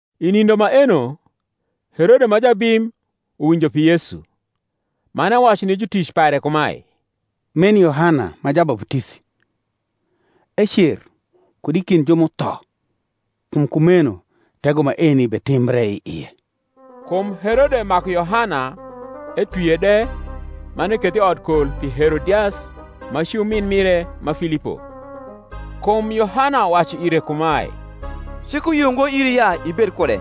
I nindo maeno Herode ma jabim uwinjo pi Yesu, man ewacu ni jutic pare kumae, Meni Yohana ma Jabaputisi; ecer kud i kind ju m’utho; kum kumeno tego maeni betimbre i ie. Kum Herode maku Yohana, etwie de, man ekethe i odkol pi Herodias, ma ci umin mire ma Filipo. Kum Yohana wacu ire kumae, Cik uyio ngo iri ya ibed kude.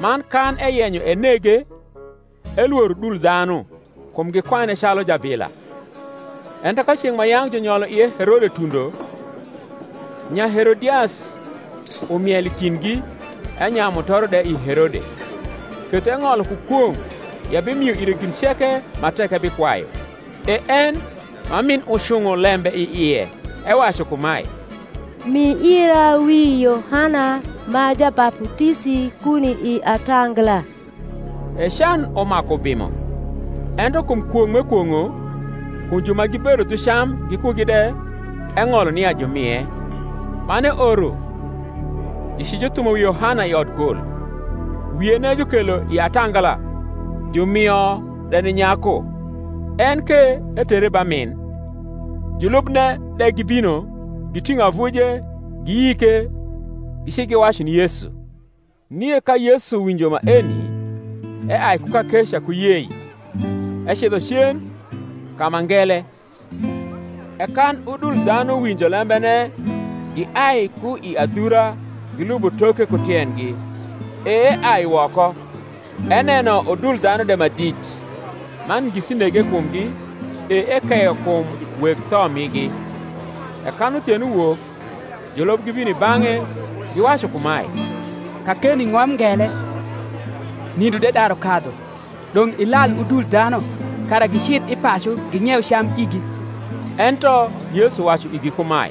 Man kan eyenyo enege, elworo udul dhanu, kum gikwane calu jabila. Ento ka ceng’ ma yang’ junyolo ie Herode tundo, Nyaherodias urniel i kindgi, enyayu mutoro de i Herode. Ketho eng’olo ku kwong’ ya ebimio ire gin ceke ma tek ebikwayu. E en, ma min ucung’o lembe i ie, ewacu kumae, Mi ira wi Yohana ma Jabaputisi kuni i atangala. E can umaku ubimo; ento kum kwong’ m’ekwong’o, kum ju ma gibedo dhu cam gikugi de, eng’olo nia jumie; man eoro jucijuthumo wi Yohana i odkol. Wiene jukelo i atangala, jumio de ni nyaku: en ke etere ba rnin. Julubne de gibino, giting’o avuje, giyike; gici giwacu ni Yesu. Nie ka Yesu winjo maeni, eai ku kakeca ku yei, ecidho cen ka ma ngele: e kan udul dhanu winjo lembene, giai ku i adhura gilubo toke ku tiendgi. E eai woko, eneno udul dhanu de ma dit, man ngisi nege i kumgi, e ekeyo kum weg tho migi. E kan uthieno wok julub gibino i bang’e, giwacu kumae, Kakeni ng’om ngele, nindo de daru kadhu: dong’ ilal udul dhanu, kara gicidh i pacu, ging’ieu cam igi. Ento Yesu wacu igi kumae,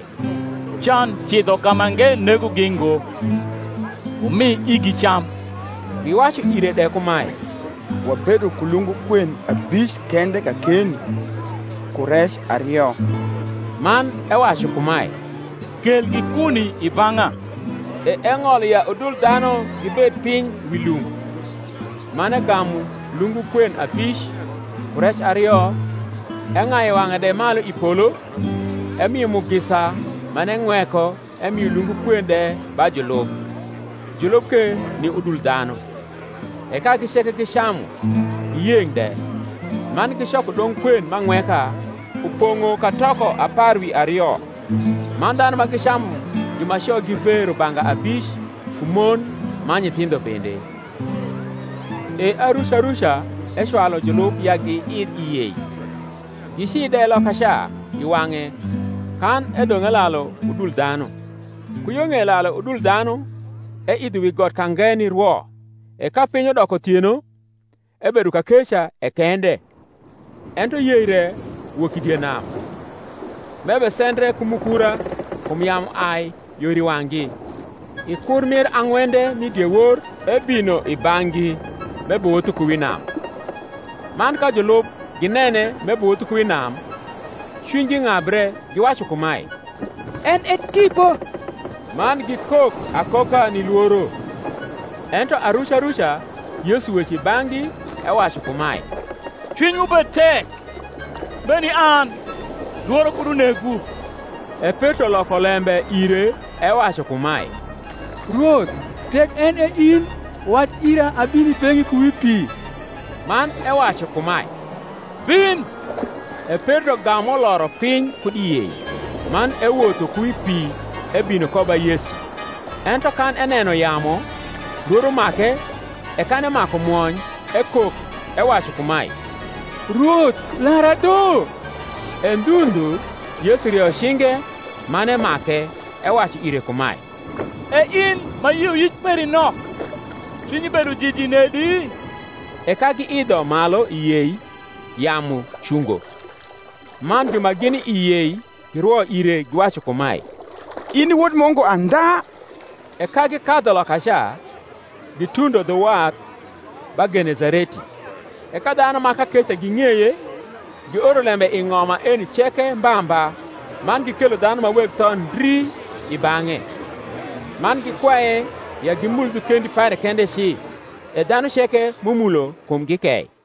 Can cidho kamange negogi ngo; wumi igi cam. Giwacu ire de kumae, Wabedo ku lungu kwen abic kende kakeni, ku rec ario. Man ewacu kumae, Kelgi kuni i bang’a. E eng’olo ya udul dhanu gibed piny wi lum; man egamu lungu kwen abic, ku rec ario, eng’ayu wang’e de malu i polo, emio mugisa man eng’weko emio lungu kwen de ba julub, julub ke ni udul dhanu. E kagi ceke gicamu, giyeng’ de: man gicoko dong’ kwen m’ang’weka, upong’o katoko apar wi ario. Man dhanu ma gicamu jumaco gi ve rubanga abic, ku mon man nyithindho bende. E aruca ruca ecwalu julub ya giidh i yei, gici de lokaca i wang’e, kan edong’ elalu udul dhanu. Ku yo ng’ei lalu udul dhanu, eidho wi got ka nge nirwo: e ka piny udoko uthieno, ebedo kakeca e kende. Ento yei re wok i die nam, m’ebesendre ku mukura; kum yamu ai yor i wang’gi. I kur mir ang’wende mi diewor ebino i bang’gi, m’ebewotho ku wi nam. Man ka julub ginene m’ebewotho ku wi nam, cwinygi ng’abre, giwacu kumae, En e tipo; man gikok akoka ni lworo. Ento aruca ruca Yesu weco i bang’gi, ewacu kumae, Cwinywu bed tek; meni an; lworo kud unegwu. E Petro loko lembe ire ewacu kumae, Rwoth, tek en e in, wac ira abin i beng’i ku wi pi. Man ewacu kumae, Bin. E Petro gam uloro piny kud i yei, man ewotho ku wi pi ebino ko ba Yesu. Ento kan eneno yamu, lworo make; e kan emaku mwony ekok, ewacu kumae, Rwoth, lara do. E ndhu ndhu Yesu rieyo cinge, man emake, ewacu ire kumae, E in ma yioyic peri nok, cwinyi bedo jiji nedi? E ka giidho malu i yei, yamu cungo. Man ju ma gini i yei girwo ire, giwacu kumae, In i Wod Mungu andha. E ka gikadhu lokaca, gitundo dhu wath, ba Genesareti. E ka dhanu ma kakeca ging’eye, gioro lembe i ng’om maeni ceke mba mba, man gikelo dhanu ma weg tho ndri i bang’e; man gikwaye ya gimul dhu kendi pare kende ci: e dhanu ceke m’umulo kumgi kei.